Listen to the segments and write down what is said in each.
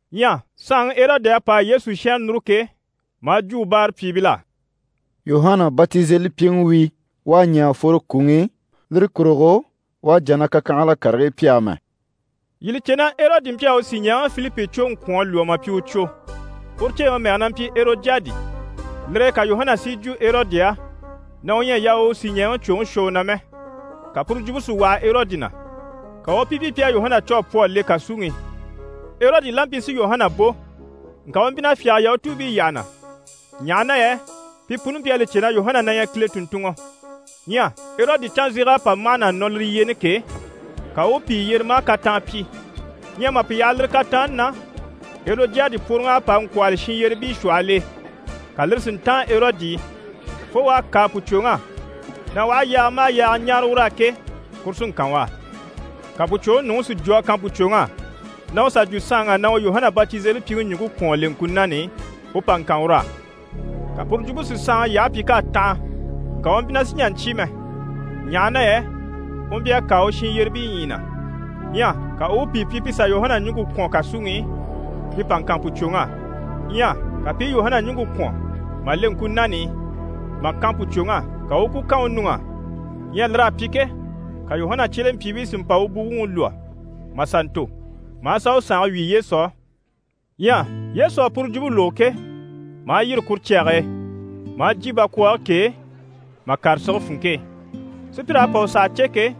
Ɲyɛ saanŋi Erɔdi à pa a Yesu shɛnrɛ núru ke, maa jwo u báarapyiibil'á: «Yuhana Batizelipyiŋi wi, u à ɲɛ̀ à fworo kwùŋi i, lire kurugo u à jà na kakyanhala karigii pyi amɛ.» Yii li cè na Erɔdi mpyi a u sìɲɛɛŋi Filipi cwoŋi kwɔ̀n a lwɔ́ mà pyi u cwo. Uru ceeŋi mɛge na mpyi Erɔdiyadi. Lire e ka Yuhana si yi jwo Erɔdi á na u ɲyɛ a yaa u u sìɲɛɛŋi cwoŋi shwɔ u na mɛ. Ka puru jwumpe si waha Erɔdi na, ka u u pi pyi pi à Yuhana cû a pwɔ a le kàsuŋi i. Erɔdi la mpyi si Yuhana bò, ŋka u mpyi na fyáge Yahutuubii yyaha na, ɲaha na yɛ pi puni mpyi a li cè na Yuhana na ɲyɛ Kile tùnntunŋɔ. Ɲyɛ Erɔdi canzeg'à pa mâhana a nɔ lire yyeeni ke, ka u u pìi yyere maa kataan pyi. Ɲyɛ mà pi yaha lire kataanni na, Erɔdiyadi pworoŋ'à pa a ŋkwɔ̂hɔli shinyyerebii shwɔhɔl'e, ka lire si ntáan Erɔdi e, fo u à kâa pùcwoŋ'á na u aha yaaga maha yaaga ɲáare ur'á ke, kuru sí n‑kan u á. Ka pùcwoŋi nuŋi si jwo a kan pùcwoŋ'á na u sà jwo saanŋ'á na u Yuhana Batizelipyiŋi ɲùŋke kwɔ̀n a le ŋkunan'i, u pa ŋkan ur'á. Ka puru jwumpe si saanŋi yyahe pyi k'à tanha. Ŋka u mpyi na sì n‑jà n‑cyé mɛ, ɲaha na yɛ u mpyi a kâa u shinyyerebii ɲyii na. Ɲyɛ ka u u pìi pyi pi sà Yuhana ɲùŋke kwɔ̀n kàsuŋi i pi pa ŋkan pùcwoŋ'á. Ɲyɛ ka pi i Yuhana ɲùŋke kwɔ̀n mà le ŋkunan'i, mà kan pùcwoŋ'á, ka u u ku kan u nuŋ'á. Ɲyɛ lir'à pyi ke, ka Yuhana cyelempyiibii si mpa u buwuŋi lwɔ́ mà sà ntò, maa sà u sànge wyì Yesu á. Ɲyɛ Yesu à puru jwumpe lógo ke, maa yîri kuru cyage e, maa jyè bakwɔɔge k'e, mà kàre sige funŋke e. Sùpyir'à pa u saha cè ke,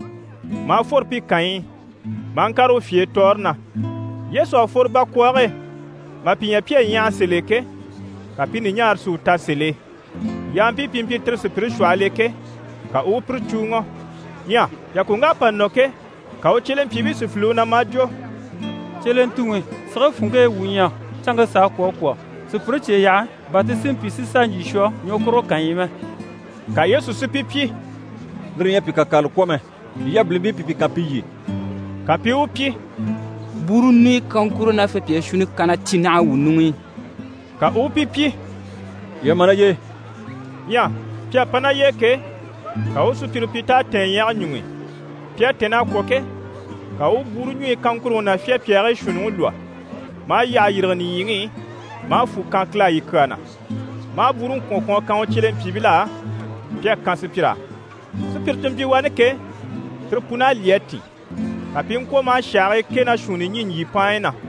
maa fworo pi kànyi i, maa ŋkàre u fye e tɔɔre na. Yesu à fworo bakwɔɔge e mà pi ɲya pi à ɲyaha sèl'e ke, ka pi ɲùɲaare si u ta sèl'e, yampii pi mpyi tire sùpyire shwɔhɔl'e ke, ka u u pire cùuŋɔ. Ɲyɛ yàkoŋk'à pa nɔ ke, ka u cyelempyiibii si file u na maa jwo: «Cyelentuŋi! Sige funŋke e wuu ɲyɛ, canŋke s'à kwɔ̀ a kwɔ̀. Sùpyire cye yaha bà ti si mpyi si sà ɲjyì shwɔ ɲwɔkurugo kànyi i mɛ.» Ka Yesu si pi pyi: «Lire ɲyɛ a pi kakarala kwɔ̀ mɛ, yii yabilimpii pi pi kan pi lyî.» Ka pi i u pyi: «Bwúuru ɲùnyɔ kaŋkuro ná fyapyaa shuunni kanna cyi naha wuu ɲuŋ'i.» Ka u u pi pyi: «Yii a ma ná y'e.» Ɲyɛ pi à pa ná y'e ke, ka u u sùpyire pyi t'à tɛ̀ɛn ɲyɛge ɲuŋ'i. Pi à tɛ̀nn'a kwɔ̀ ke, ka u u bwúuru ɲùɲyi kaŋkuruŋi ná cyire fyapyaagii shuunniŋi lwɔ́, maa yyahe yîrige nìɲyiŋi i, maa fwù kan Kile á yi kyaa na. Maa bwúuruŋi kwɔ̀n kwɔ̀n a kan u cyelempyiibil'á, pi à kan sùpyir'á. Sùpyire ti mpyi wani ke, tire pun'à lyî a tìn. Ka pi i ŋkwɔ̀ maa shàhii kɛ ná shuunni ɲî ɲjyìpaanyi na.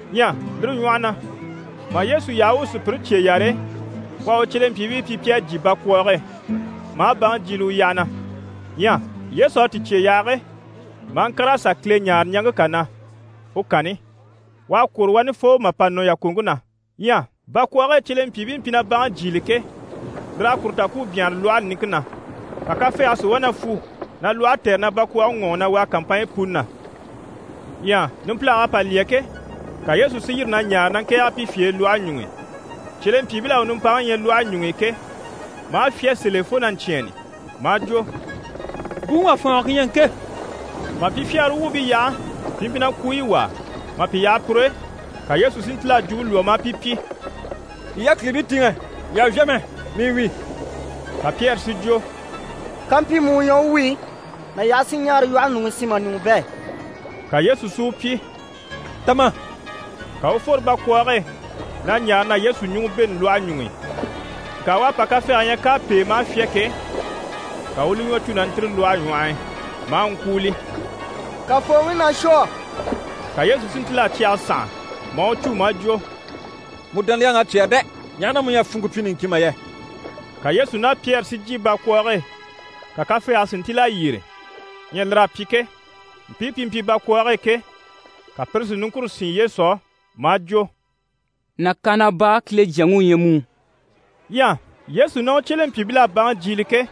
Ɲyɛ lire ɲwɔhɔ na, mà Yesu yaha u u sùpyire cye yare, u à u cyelempyiibii pyi pi à jyè bakwɔɔge e, maa baŋi jyiile u yyaha na. Ɲyɛ Yesu à ti cye yaha ke, maa ŋkàr'a sà Kile ɲáare ɲaŋke kà na, u kanni. U à kwôro wani fo mà pa nɔ yàkoŋke na. Ɲyɛ bakwɔɔge e cyelempyiibii mpyi na baŋi jyiili ke, lir'à kuru ta ku u byanhare lwɔhe niŋke na. Ka kafɛɛge si wá na fwu na lwɔhe tɛ̀re na bakwɔɔge ŋɔɔŋi na wàa kàmpanɲyi puni na. Ɲyɛ numpilag'à pa lyɛ ke, ka Yesu si yîri na ɲaare na ŋkɛ̀ɛge pi fye e lwɔhe ɲuŋ'i. Cyelempyiibil'à u nimpaŋi ɲya lwɔhe ɲuŋ'i ke, maa fyá sèl'e fo na ɲcyɛ̂ɛnni maa jwo: «Buŋi wà fwɔ̀ɔngɔ ku ɲyɛ ŋke!» Mà pi fyagara wuubii yaha, pi mpyi na kwuuyi wàa. Mà pi yaha pur'e, ka Yesu si ntíl'a jwumpe lwɔ́ maa pi pyi: «Yii yákilibii tìŋɛ, yii àha vyá mɛ, mii wi.» Ka Pyɛri si jwo: «Kampyi mu u ɲyɛ u wi, na yaha si ɲaara lwɔhe ɲuŋ'i, si ma ɲùŋɔ bɛ̂.» Ka Yesu si u pyi: «Ta ma.» Ka u u fworo bakwɔɔge e na ɲaare na Yesu ɲùŋɔ bêni lwɔhe ɲuŋ'i. Ŋka u à pa kafɛɛge ɲya k'à pêe maa fyá ke, ka u u li ɲwɔ cû na ntîri lwɔhe ɲwɔh'i, maa ŋkwúuli: «Kafooŋi, na shwɔ!» Ka Yesu si ntíl'a cyɛge sànha, maa u cû maa jwo: «Mu dániyaŋ'à cyɛ́rɛ dɛ! Ɲaha na mu ɲyɛ a funŋke pyi niŋkin mà yɛ?» Ka Yesu ná Pyɛri si jyè bakwɔɔge e, ka kafɛɛge si ntíl'a yyére. Ɲyɛ lir'à pyi ke, mpii pi mpyi bakwɔɔge e ke, ka pire si niŋkure sín Yesu á maa jwo: «Nàkaana baa, Kile Jyaŋi u ɲyɛ mu.» Ɲyɛ Yesu ná u cyelempyiibil'à baŋi jyiile ke,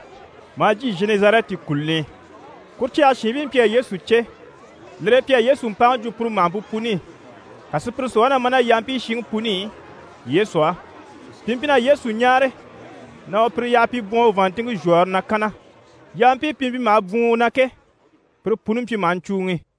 maa jyè Zhenɛzarɛti kùluni i. Kuru cyage shiinbii mpyi a Yesu cè, lire e pi à Yesu mpaŋi jwo puru màhampe puni i. Ka sùpyire si wá na ma ná yampii shinŋi puni i Yesu á. Pi mpyi na Yesu ɲáare na u pire yaha pi i bwɔ̀n u vàanntinŋke zhwɔ̀ɔre na kanna. Yampii pi mpyi maha bwùun u na ke, pire puni mpyi maha ɲcùuŋi.